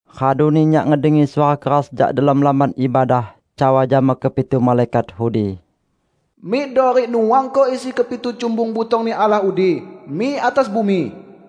Raduni nyak ngedengi suara keras jak delom Lamban Ibadah cawa jama kepitu malaikat udi, "Mikdo rik nuangko isi kepitu cumbung butong-Ni Allah udi mik atas bumi!"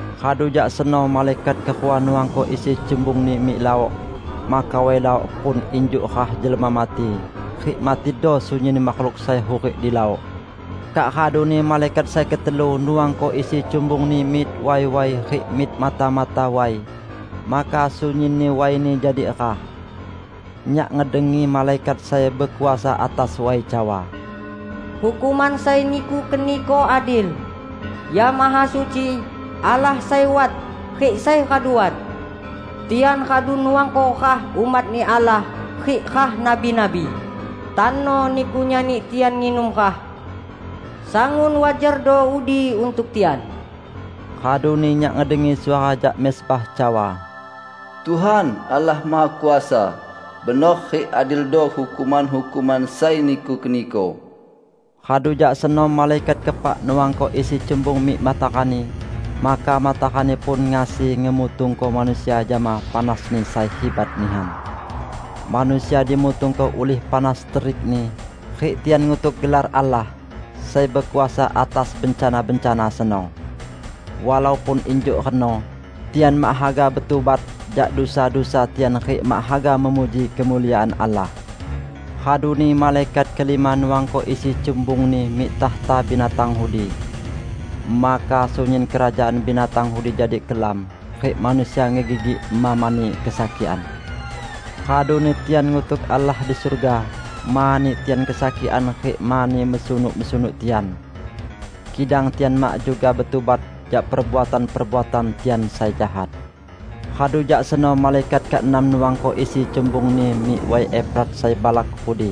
Radu jak seno malaikat kerua nuangko isi cumbungni mik laok. Maka way laok pun injuk rah jelma mati, rik matido sunyin makhluk sai hurik di laok. Kak raduni malaikat sai ketelu nuangko isi cumbungni mik way-way rik mik mata-mata way, maka sunyinni wayni jadi rah. Nyak ngedengi malaikat sai bekuasa atas way cawa, "Hukuman sai Niku keniko adil, ya Mahasuci, Allah sai wat, rik sai radu wat. Tian radu nuangko rah umat-Ni Allah rik rah nabi-nabi; tano Niku nyani tian nginum rah. Sangun wajardo udi untuk tian!" Raduni nyak ngedengi suara jak mezbah cawa, "Tuhan, Allah Mahakuasa, benor rik adildo hukuman-hukuman sai Niku keniko!" Radu jak seno malaikat keepak nuangko isi cumbung mik matarani, maka matarani pun ngasi ngemutungko manusia jama panasni sai hibat nihan. Manusia dimutungko ulih panas terikni, rik tian ngutuk gelar Allah, sai bekuasa atas bencana-bencana seno. Walaupun injuk reno, tian mak haga betubat jak dusa-dusa tian rik mak haga memuji kemuliaan Allah. Raduni malaikat kelima nuangko isi cumbungni mik takhta binatang udi. Maka sunyin kerajaan binatang udi jadi kelam, rik manusia ngegigik ema mani kesakikan. Raduni tian ngutuk Allah di surga mani tian kesakikan rik mani mesunuk-mesunuk tian. Kidang tian mak juga betubat jak perbuatan-perbuatan tian sai jahat. Radu jak seno malaikat keenam nuangko isi cumbungni mik Way Efrat sai balak udi.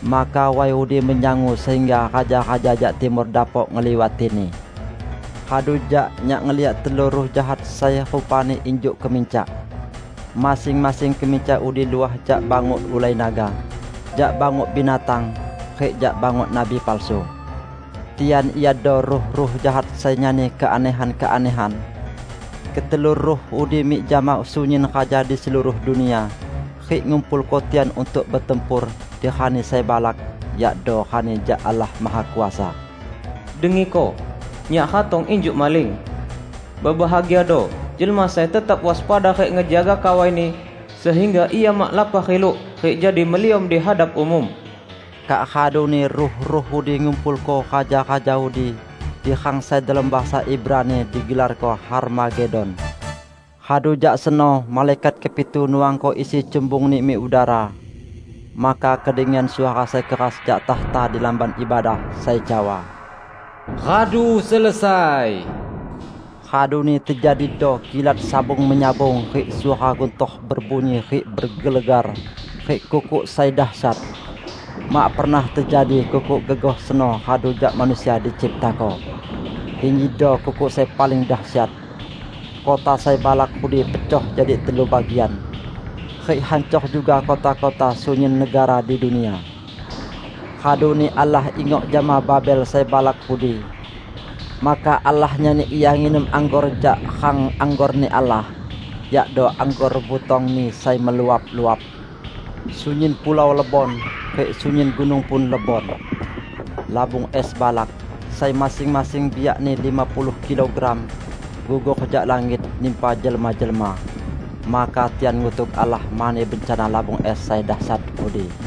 Maka way udi menyangu sehingga raja-raja jak timur dapok ngeliwatini. Radu jak nyak ngeliak telu ruh jahat sai rupani injuk kemincak. Masing-masing kemincak udi luah jak banguk ulai naga, jak banguk binatang, rik jak banguk nabi palsu. Tian iado ruh-ruh jahat sai nyani keanehan-keanehan. Ketelu ruh udi mik jama sunyin raja di seluruh dunia rik ngumpulko tian untuk betempur di Rani sai balak, yakdo Rani jak Allah Mahakuasa. "Dengiko! Nyak ratong injuk maling! Bebahagiado jelma sai tetap waspada rik ngejaga kawaini, sehingga ia mak lapah riluk rik jadi meliom di hadap umum!" Kak raduni ruh-ruh udi ngumpulko raja-raja udi di rang sai delom bahasa Ibrani digelarko Harmagedon. Radu jak seno malaikat kepitu nuangko isi cumbungni mik udara. Maka kedengian suara sai keras jak takhta di Lamban Ibadah, sai cawa, "Radu selesai!" Raduni tejadido kilat sabung-menyabung rik suara guntor bebunyi rik bergelegar, rik kukuk sai dasyat. Mak pernah tejadi kukuk gegoh seno radu jak manusia diciptako. Injido kukuk sai paling dasyat! Kota sai balak udi pecoh jadi telu bagian, rik hancor juga kota-kota sunyin negara di dunia. Raduni Allah ingok jama Babel sai balak udi. Maka Allah nyani ia nginum anggor jak rang anggor-Ni Allah -- yakdo anggor butong-Ni sai meluap-luap. Sunyin pulau lebon, rik sunyin gunung pun lebon. Labung es balak, sai masing-masing biakni lima puluh kilogram, gugor jak langit nimpa jelma-jelma. Maka tian ngutuk Allah mani bencana labung es sai dasyat udi.